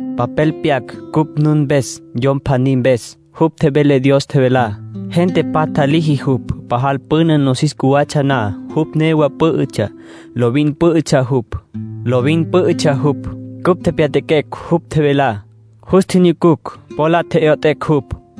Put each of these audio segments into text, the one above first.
Papel pyaquecj cupj nun mpes yom pjaní mpes. Jupj tjevele Dios tjevelá. Gente patja liji jupj. Pajal püna nosis cjuwatsja na, jupj newa pǘ'ütsja. Lovin pǘ'ütsja jupj. Cupj tjepjya'aquecj jupj tjevelá. Jus tjinyucucj. Po la tje'yot'ecj jupj.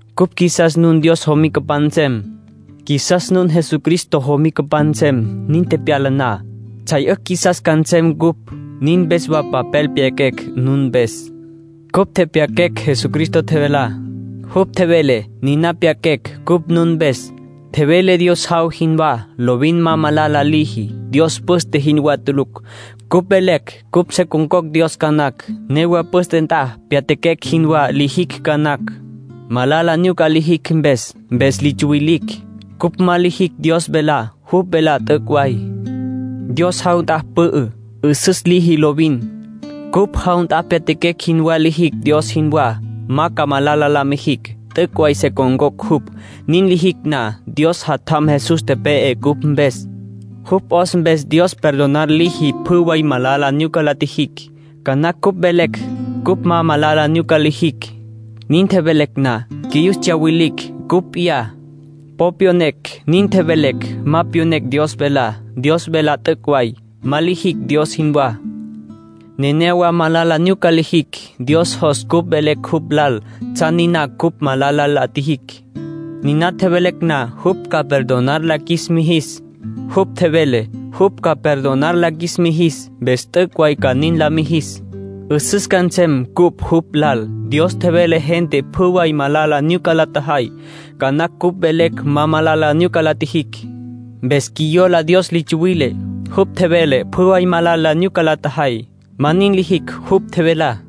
Cupj qjuisas nun Dios jomicapan nsem. Qjuisas nun Jesucristo jomicapan nsem. Nin tepyala na, tsjay 'ücj qjuisas ca nsem ncupj. Nin mpes wa papel pyaquecj nun mpes. Cupj tjepjya'aquecj Jesucristo tjevelá. Jupj tjevele, niná pyaquecj cupj nun mpes. Tjevele Dios jaw jinwá. Lovin ma malala liji. Dios püste jinwá tulucj. Cupj velecj cupj se con̈cocj Dios ca nacj. Newa püste nt'a pyatjaquecj jinwá lijicj ca nacj, malala nyuca lijicj mpes. Mpes li tsuwilicj. Cupj ma lijicj Dios velá. Jupj velá t'üc' way. Dios jaw nt'a pü'ü. 'Üsüs liji lovin. Cupj jaw nt'a pyatjaquecj jin wa lijicj Dios jinwá, ma ca malala la mijicj. T'üc' way se con̈cocj jupj, nin lijicj na. Dios Jatjam Jesús tepe'e cupj mpes. Jupj 'os mpes Dios perdonar liji pjü way malala nyuca la tjijicj. Ca nacj cupj velecj cupj ma malala nyuca lijicj. Nin tjevelecj na, qjuiyus tsyawilicj ncupj p'iyá. Po pyonecj nin tjevelecj; ma pyonecj Dios velá. Dios velá t'üc' way. Ma lijicj Dios jinwá. Nenéyawa malala nyuca lijicj. Dios jos cupj velecj jupj lal tsjan niná cupj malala la tjijicj. Niná tjevelecj na, jupj ca perdonar la qjuis mijis. Jupj tjevele jupj ca perdonar la qjuis mijis, mpes t'üc' way ca nin la mijis. 'Üsüs ca nsem cupj jupj lal. Dios tjevele gente pjü way malala nyuca la tjajay. Ca nacj cupj velecj ma malala nyuca la tjijicj. Mpes qjuiyola Dios li tsuwile. Jupj tjevele pjü way malala nyuca la tjajay. Ma nin lijicj jupj tjevelá.